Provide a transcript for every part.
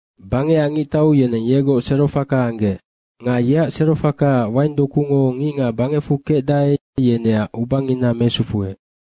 Bangecac ngictau yeneng yegoc serofaka anggec nga yeac serofakaac waingdokungo ngicngac bangecfu kecdae, yeneac ubangina mesufuec.”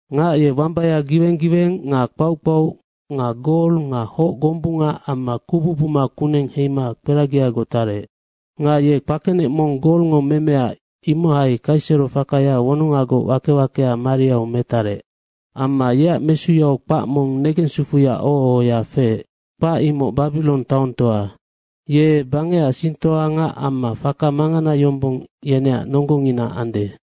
Ngac ye wamba giweng giweng nga kpauc kpauc nga gol nga hoc gombunga amma kubu buma kuneng heima kperagiagoc tarec. Nga ye kpakenec mong golngo memea, imohai kaiserofakaya wonongagoc wake wakea mariau metarec. Amma yeac mesuyau kpac mong negensufuya oho ohoya feec. Kpac imoc Babirong taongtoa, ye bangecac singtoangac amma faka mangana yombong yeneac nonggongina ande.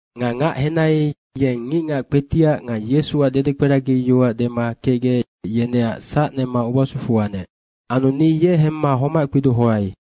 Nga ngac henai, yeng ngicngac kpetiac nga Yesuac dedekperagi yoac dema kecgec, yeneac sac nema ubasufu anec. Anu ni ye hemma homac kpidohoai.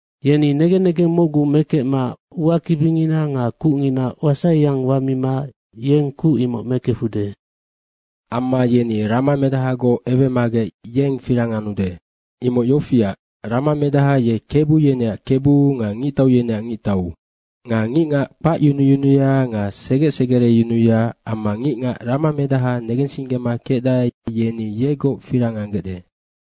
Yeni negen negeng mocgu mekecma uakibingina nga kucngina wasaiyang wamima yeng kuc imoc mekefude. Amma yeni ramamedahagoc ewemagec yeng firang anude. Imoc yofiac, ramamedaha ye kebu yeneac Kebu nga ngictau yeneac Ngictau. Nga ngicngac kpacyunuyunuya nga segec segereyunuya amma ngicngac ramamedaha negensinggema kecdae, yeni yegoc firang anggecde.”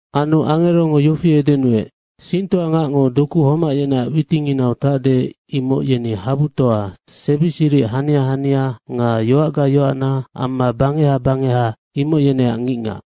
Anu angerongo yofi edenuec, “Singtoangacngo doku homac yeneac witinginau tacde, imoc yeni habu toa, sebi siric hania hania nga yoacga yoacna amma bangeha bangeha imoc yeneac ngicngac.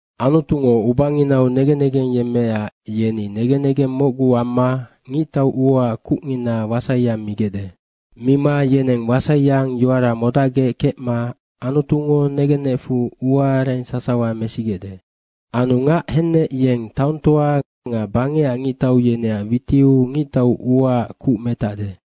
Anutungo ubanginau negen negeng yemmeecac yeni negen negeng mocgu amma ngictau uaac kucngina wasaiyang migecde. Mima yeneng wasaiyang yoara modacgec kecma Anutungo negenecfu uaareng sasawa mesigecde. Anu ngac hennec yeng taongtoa nga bangecac ngictau yeneac witiu ngictau uaac kuc metacde.”